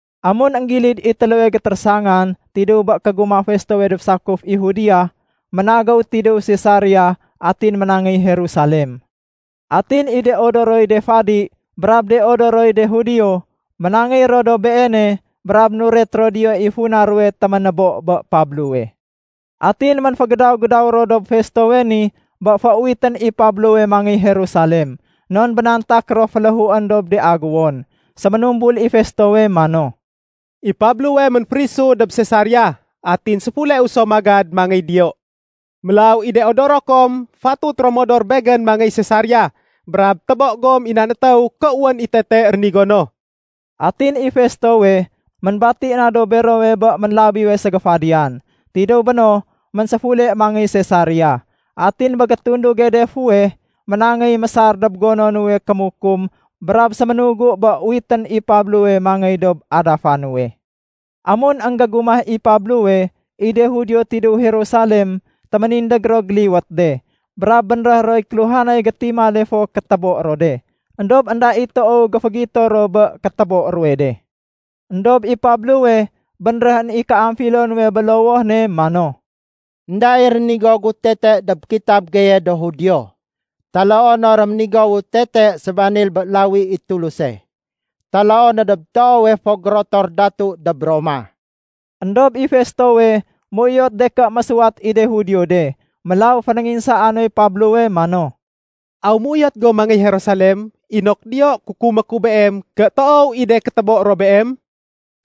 Amun énggilid i téléwe gétérésangan tidéw bé kégumah Festowe dob sakuf i Judea, ménagéw tidéw Sesaria atin ménangéy Jerusalem. Atin i de odoroy de fadi brab de odoroy de Judio ménangéy ro dob beene brab nuret ro diyo i funa ruwe téménébo bé Pablowe. Atin ménfégédaw-gédaw ro dob Festowe ni bé féuwitén i Pablowe mangéy Jerusalem, non bénantak ro féléhuén dob de agéwon. Séménumbul i Festowe mano, “I Pablowe ménférisu dob Sesaria, atin séfuleu so magad mangéy diyo. Mélaw i de odoro kom fatut ro modor begén mangéy Sesaria brab tébo gom i nan étéw ké wén i tete rénigo no.” Atin i Festowe ménbati na dob berowe bé ménlabiwe ségéfadiyan. Tidéw béno ménséfule mangéy Sesaria. Atin bé gétunduge de fuweh, ménangéy mésar dob gono nuwe kémukum brab séménugu bé uwitén i Pablowe mangéy dob adafa nuwe. Amun énggégumah i Pablowe, i de Judio tidéw Jerusalem téménindég ro géliwét de, brab bénréh roy kéluhanay gétimale fo kétébo ro de. Endob énda i toow géfégito ro bé kétébo ruwe de. Endob i Pablowe bénréhén i kéamfilo nuwe bé lowoh ne mano, “Enda i rénigo gu tete dob kitab geye do Judio, taloo no réménigowu tete sébanil bé lawi i Tuluse, taloo no dob toowe fo gérotor datu dob Roma.” Endob i Festowe méuyot de ké mésuwat i de Judio de, mélaw fénénginsaa noy Pablowe mano, “Aw méuyot go mangéy Jerusalem inok diyo kukumé ku beem ké toow i de kétébo ro beem?”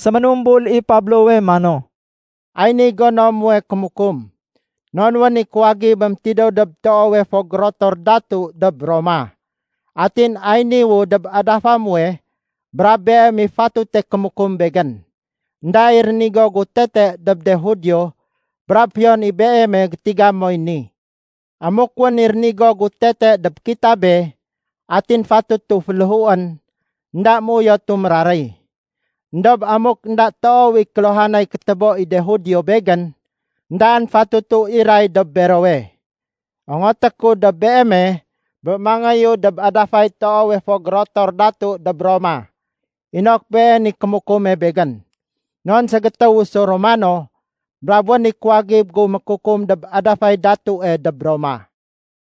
Séménumbul i Pablowe mano, “Ay niy gono muwe kémukum, non wén i kuwagibém tidéw dob toowe fo gérotor datu dob Roma. Atin ay niwu dob adafa muwe brab beem i fatute kémukum begén. Enda i rénigo gu tete dob de Judio brab fiyon i beeme gétiga moy ni. Amuk wén i rénigo gu tete dob kitabe atin fatutu féléhuén, énda méuyotu méraréy. Endob amuk énda toow i kéluhanay kétébo i de Judio begén, éndaén fatutu iray dob berowe. Ongoté ku dob beeme bé mangéyu dob adafay toowe fo gérotor datu dob Roma inok been i kémukume begén. Non ségétéwu so Romano, brab wén i kuwagib gu mékukum dob adafay datue dob Roma.”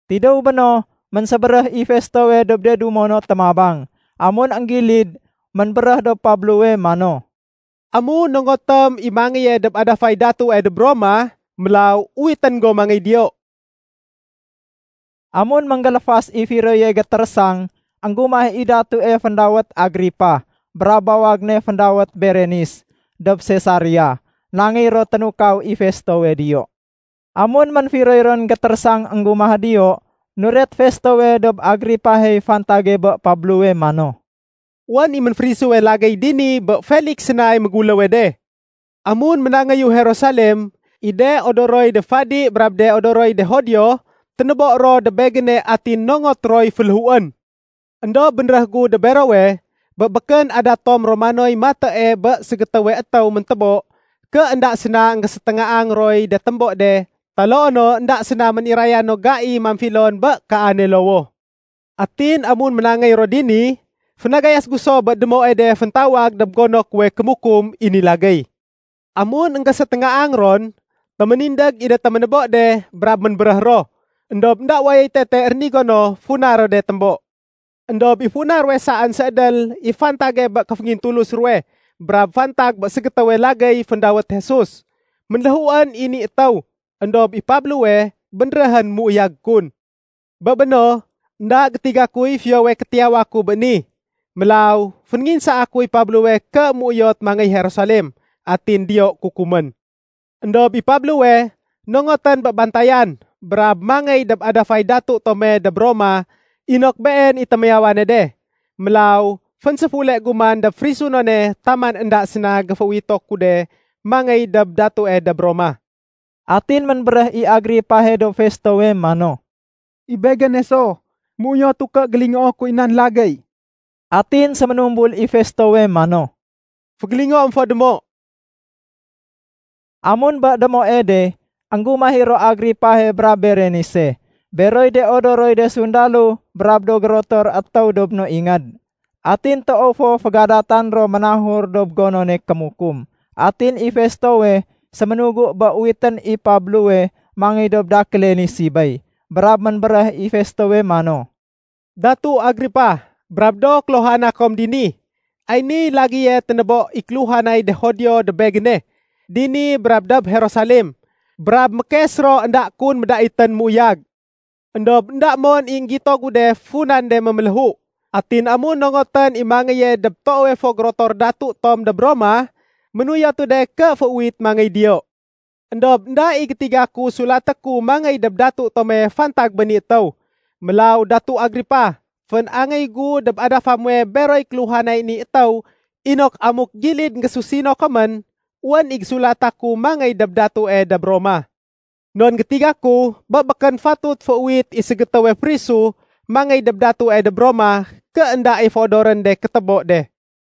Tidéw béno, ménsébéréh i Festowe dob de dumo no témabang. Amun énggilid, ménbéréh dob Pablowe mano, “Amun nongotém i mangéye dob adafay datue dob Roma, mélaw uwitén go mangéy diyo.” Amun ménggéléfas i firoye gétérésang, énggumah i datue féndawét Agripa brab bawag ne féndawét Berenis dob Sesaria. Nangéy ro ténukaw i Festowe diyo. Amun ménfiroy ron gétérésang énggumah diyo, nuret Festowe dob Agripahey fantage bé Pablowe mano, “Wén i ménférisuwe lagéy dini bé Feliks sénay méguléwe de. Amun ménangéyu Jerusalem, i de odoroy de fadi brab de odoroy de Judio, ténébo ro dob begéne atin nongot roy féléhuén. Endob bénréh gu dob berowe bé békén adat tom Romanoy matée bé ségétéwe étéw méntébo ké énda séna énggéséténgaang roy de témbo de taloo no énda séna méniraya no gai mamfilon bé kaane lowoh. Atin amun ménangéy ro dini, fénagayas gu so bé démoe de féntawag dob gono kuwe kémukum i ni lagéy. Amun énggéséténgaang ron, téménindég i de téménébo de brab ménbéréh ro. Endob énda wayoy tete rénigo no funa ro de témbo. Endob i funa ruwe saén séédél i fantage bé kéféngintulus ruwe brab fantag bé ségétéwe lagéy féndawét Jesus. Ménléhuén i ni étéw éndob i Pablowe bénréhén méuyag kun. Bé béno, énda gétiga kuy fiyowe kétiyawa ku bé ni, mélaw fénénginsaa kuy Pablowe ké méuyot mangéy Jerusalem atin diyo kukumén. Endob i Pablowe nongotén bé bantayan brab mangéy dob adafay datu tome dob Roma inok been i témiyawane de. Mélaw fénséfule gu man dob férisunone taman énda séna géféuwito ku de mangéy dob datue dob Roma.” Atin ménbéréh i Agripahe dob Festowe mano, “I begéne so, Méuyotu ké gélingoo kuy nan lagéy.” Atin séménumbul i Festowe mano, “Fégélingoém fo démo.” Amun bé démoe de, énggumah i ro Agripahe brab Berenise, beroy de odoroy de sundalo brab do gérotor étéw dob no ingéd. Atin toow fo fégadatan ro ménahur dob gonone kémukum. Atin i Festowe séménugu bé uwitén i Pablowe mangéy dob dakéle ni sibéy. Brab ménbéréh i Festowe mano, “Datu Agripa brab do kéluhana kom dini, ay niy lagéye ténébo i kéluhanay de Judio dob begéne, dini brab dob Jerusalem. Brab mékes ro énda kun médaitén méuyag. Endob énda mon i énggito gu de funan de méméléhu. Atin amun nongotén i mangéye dob toowe fo gérotor datu tom dob Roma, ménuyotu de ké féuwit mangéy diyo. Endob énda i gétiga ku sulaté ku mangéy dob datu tome fantag bé ni étéw. Mélaw Datu Agripa, fén-angéy gu dob adafa muwe beroy kéluhanay ni étéw inok amuk gilid énggésusino komén, wén i gésulata ku mangéy dob datue dob Roma. Non gétiga ku bé békén fatut féuwit i ségétéwe férisu mangéy dob datue dob Roma ké énda i féodorén de kétébo de.”